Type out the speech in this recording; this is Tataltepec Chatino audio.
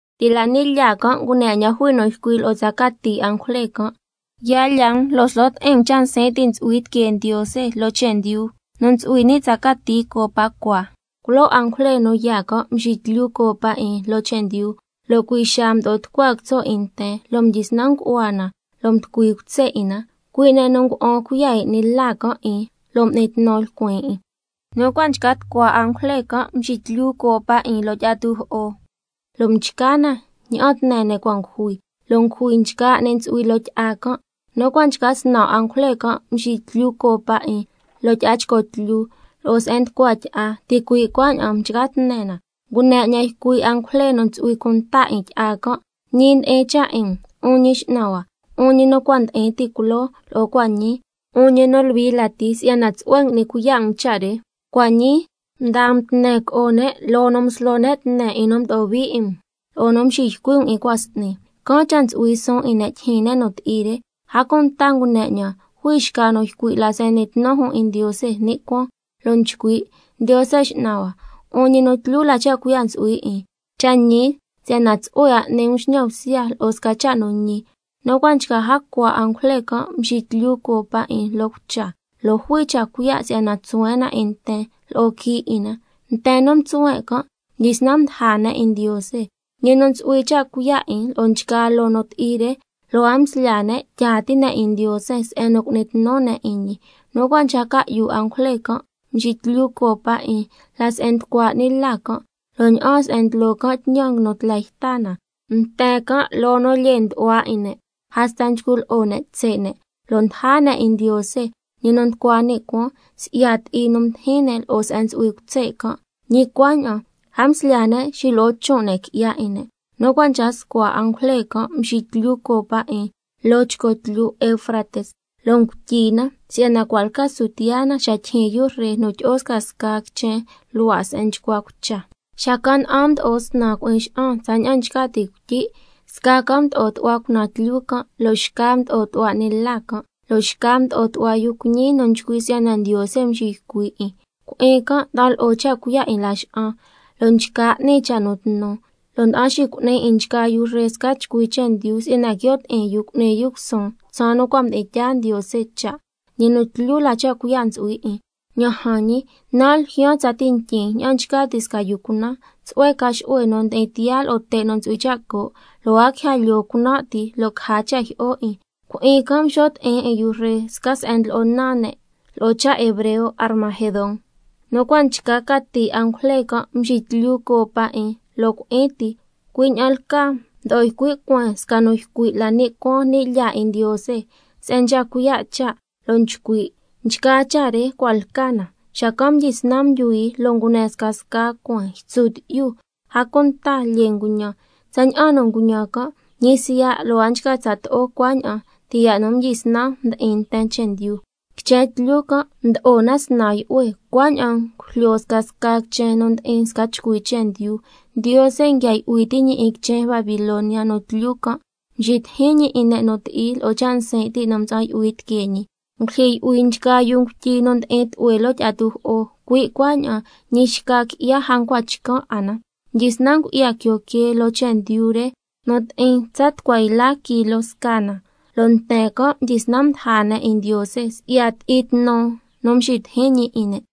Ti' la ni' lyaa can' ngune 'ñan jui nu ycui' lo'o tsa cati angujle can': Ya lya um lo' slo ti'in um cha' nsin' ti' ntsu'hui tiquee Ndiose loo chendyu, nu ntsu'hui ni' tsa cati copa cua. Culoo angujle nu yaa can' mxiquilyu copa 'in loo chendyu, lo' cui' xaa mdo'o tucua quitso' 'in nten, lo' mdyisnan ngu'hua na lo' mducui cutse' 'in na, cui' ne' nu ngua'an cuiya' 'in 'ni la can' 'in lo' m'ni tnu lcuin 'in. Nu cua' nchca tucua angujle can' mxiquilyu copa 'in loo tyi'a tujo'o, lo' mchca na ña'an tne ne' cua' ngujui, lo' ngujui nchgaa 'ni ntsu'hui loo tyi'a can'. Nu cua' nchca snan angujle can' mxiquilyu copa 'in loo tyi'a chco tlyu, lo'o se'en nducua tyi'a, ticui' cuaña'an mchca tne na. Ngune 'ñan ycui' angujle nu ntsu'hui cunta 'in tyi'a can': Ñi ndi'in cha' 'in um, 'un Ñi X'nan hua, 'un ñi nu cua' ndi'in ti' culoo, lo'o cua' ñii, 'un ñi nu Luhui lati, si'yana tsu'hue ngui'ni cuiya' um cha' re. Cua' ñii mdaa um tne co'o ne', loo nu mslo ne' tne 'in nu mdo'o hui 'in um, lo'o nu mxiycui' um 'in cua' s'ni, can' cha' ntsu'hui suun 'in ne' tyijyin ne' nu ti'i re. A cunta ngune 'ñan jui xca nu ycui' la se'en n'ni tnu jun 'in Ndiose ni' cuaan, lo' nchcui': Ndiose X'nan hua, 'un ñi nu tlyu la cha' cuiya' ntsu'hui 'in, cha' ñi si'yana tsu'hue 'a n'ni um xñan bsya lo'o sca cha' nu ñi. Nu cua' nchca jacua angujle can' mxiquilyu copa 'in loo cucha, lo' jui cha' cuiya' si'yana tsuhuen' na 'in nten lo'o quii' 'in na. Nten nu mtsuhuen' can' mdyisnan mdaja ne' 'in Ndiose, ñi nu ntsu'hui cha' cuiya' 'in lo'o nchgaa loo nu ti'i re, lo' a mslyaa ne' tyaa ti' ne' 'in Ndiose se'en nu cu'ni tnu ne' 'in ñi. Nu cua' nchca ca'yu angujle can' mxiquilyu copa 'in la se'en nducua 'ni la can', lo' ña'aan se'en ndlo can' tñan nguinu tla yta na. Nten can' loo nu lyee ndu'hua 'in ne' hasta nchcu lo'o ne' tse' ne', lo' mdaja ne' 'in Ndiose, ñi nu nducua ni' cuaan, si'ya ti'i nu mdijin ne' lo'o se'en ntsu'hui cutse' can', ñi cuaña'an a mslyaa ne' xilo'o chon' ne' qui'ya 'in ne'. Nu cua' nchca scua angujle can' mxiquilyu copa 'in loo chco tlyu Eufrates, lo' ngutyi na si'yana cua' lca su tiyaa na, xa tyijyin yu ree nu tyi'o scasca quichen luhua' se'en nchcua cucha. Xacan' na'an mdo'o snan cui'in xa'an tsaña'an nchca ti' cuityi', sca can' mdo'o tu'hua cunaan tlyu can', lo' xca mdo'o tu'hua 'ni la can', lo' xca mdo'o tu'hua yu cuiñi nu nchcui' si'yana Ndiose nxiycui' 'in. Cui'in can' nda'an lo'o cha' cuiya' 'in laxa'an lo' nchca n'ni cha' nu tnu, lo' nda'an xicu'ni 'in nchgaa yu ree sca chcui chendyu si'yana quio' ti'in yu cu'ni yu cusuun tsaan nu cua' mdi'in tyaa Ndiose cha', ñi nu tlyu la cha' cuiya' ntsu'hui 'in. Ña'an jan ñi, nan' ljyaan tsati ntyin ña'an nchca ti' sca yu cunan. Tsu'hue ca xu'hue nu ndi'in tiyaa lo'o te' nu ntsu'hui cha' co', lo' a quija lyoo cunan' ti lo' caja cha' jyi'o 'in. Cui'in can' mxo' ti'in 'in yu ree, sca se'en ndlo'o naan ne' lo'o cha' hebreo Armagedón. Nu cua' nchca cati angujle can' mxiquilyu copa 'in loo cui'in ti, cui' ña'an lcaa mdo'o ycui' cueen sca nu ycui' la ni' cuaan ni' lyaa 'in Ndiose, se'en nchca cuiya' cha', lo' nchcui': Nchgaa cha' re cua' lca na. Xacan' mdyisnan ndyuhui lo' ngune scasca cueen, ytsu tyi'yu, a cunta lyee nguñan, tsaña'an nu nguñan can', ñi siya' lo' a nchca tsato'o cuaña'an ti' ya' nu mdyisnan mdi'in nten chendyu. Quichen tlyu can' mdo'o na snan yu'hue, cuaña'an ngujlyo scasca quichen nu ndi'in sca chcui chendyu. Ndiose nguia yu'hui ti' ñi 'in quichen Babilonia nu tlyu can', mxitijin ñi 'in ne' nu ti'i lo'o cha' nsin' ti' nu mtsa'an yu'hui tiquee ñi. Ngulyijyi yu'hui nchgaa yuu ngutyi nu ndi'in tlu'hue loo tyi'a tujo'o, cui' cuaña'an ñi xca qui'ya a ncua chcan' 'a na. Mdyisnan ngu'ya quio quee loo chendyu re nu ti'in tsa tucua yla kilo scaa na, lo' nten can' mdyisnan mdaja ne' 'in Ndiose si'ya ti'i tnu nu mxitijin ñi 'in ne'.